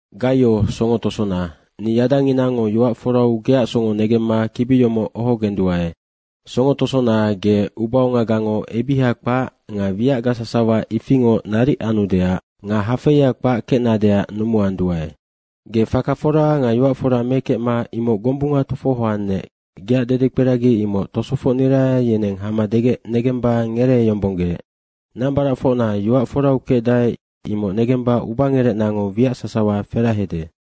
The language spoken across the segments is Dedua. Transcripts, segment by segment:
Gaio songo tosona, ni yadanginango yoac forau geac songo negemma kibi yomoc ohogenduae. Songo tosona, ge ubaongagango ebiha kpac nga wiacga sasawa ifingoc naric anudeac nga hafeia kpac kecnadeac numuanduae. Ge faka fora nga yoac fora mekecma imoc gombunga tofohoannec, geac dedekperagi imoc tosofocnira yeneng hama degec negemba ngereeyombonggeec. Nambaracfocna yoac forau kecdae, imoc negemba ubangerecnango wiac sasawa ferahede.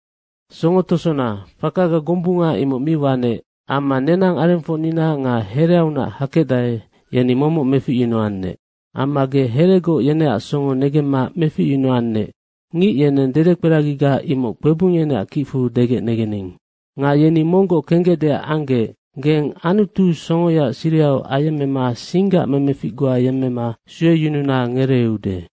Songo tosona, fakaga gombunga imoc mi wanec amma nenang arengfocnina nga hereaunac hakecdae, yeni momoc meficyunuannec. Amma ge heregoc yeneac songo negemma meficyunuannec, ngic yeneng dedekperagiga imoc kpebung yeneac kicfu degec negening. Nga yeni monggoc kenggecdeac anggec geng Anutu songoyaac sirihau ayemmema singgac memefic goa yemmema sueyununa ngereeude.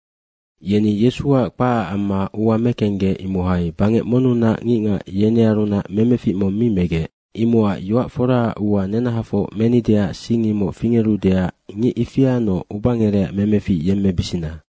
Yeni Yesuac kpacac amma ua mekenggec, imohai bangec monnunac ngicngac yenearunac memefic mong mi megec. Imocac yoac foraac ua nenahafoc menideac sing, imoc fingerudeac ngic ifianoc ubangerecac memefic yemmebisina.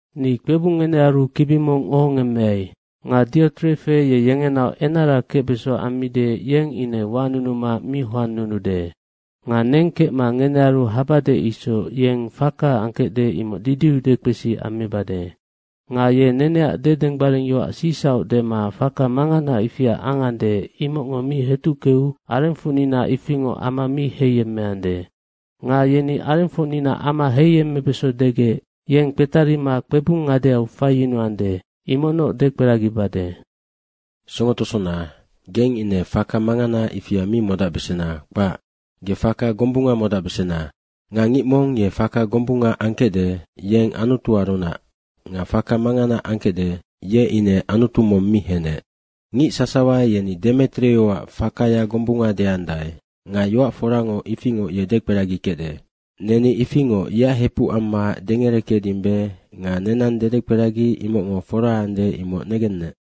Ni kpebung ngenearu kibi mong ohongemmeai. Nga Diotrefe ye yengenaoc enara kecbeso ammide, yeng ine wanunuma mi hoannunude. Nga neng kecma ngenearu habade isoc, yeng faka angkecde, imoc didiu dekpesi ammibade. Nga ye neneac dedenggbaringyoac sicsauc dema faka mangana ifia angande, imocngo mi hetuckeu arengfocnina ifingoc ama mi heiyemmeande. Nga yeni arengfocnina ama heiyemmebeso degec yeng kpetarima kpebung ngadeau faiyunuande, imocnoc dekperagibade. Songo tosona, geng ine faka mangana ifia mi modacbesena, kpac. Ge faka gombunga modacbesena. Nga ngic mong ye faka gombunga angkecde, yeng Anutuarunac nga faka mangana angkecde, ye ine Anutu mong mi henec. Ngic sasawa yeni Demetrioac fakaya gombunga deandae nga yoac forango ifingoc ye dekperagikecde. Neni ifingoc yeac hepuc amma dengerekecdimbe nga nenang dedekperagi imocngo fora ande, imoc negennec.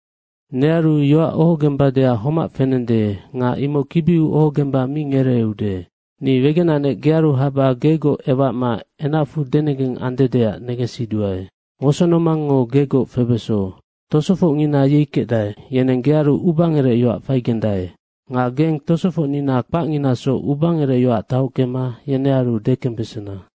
Nearu yoac ohogembadeac homac fenende nga imoc kibiu ohogemba mi ngereeude. Ni wegenanec gearu haba gegoc ewacma enacfu denegeng andedeac negensiduae. Wosonomangngo gegoc febeso. Tosofocngina yei kecdae, yeneng gearu ubangerecyoac faigendae. Nga geng tosofocnina kpacnginasoc ubangerecyoac tahockema yenearu dekembesena.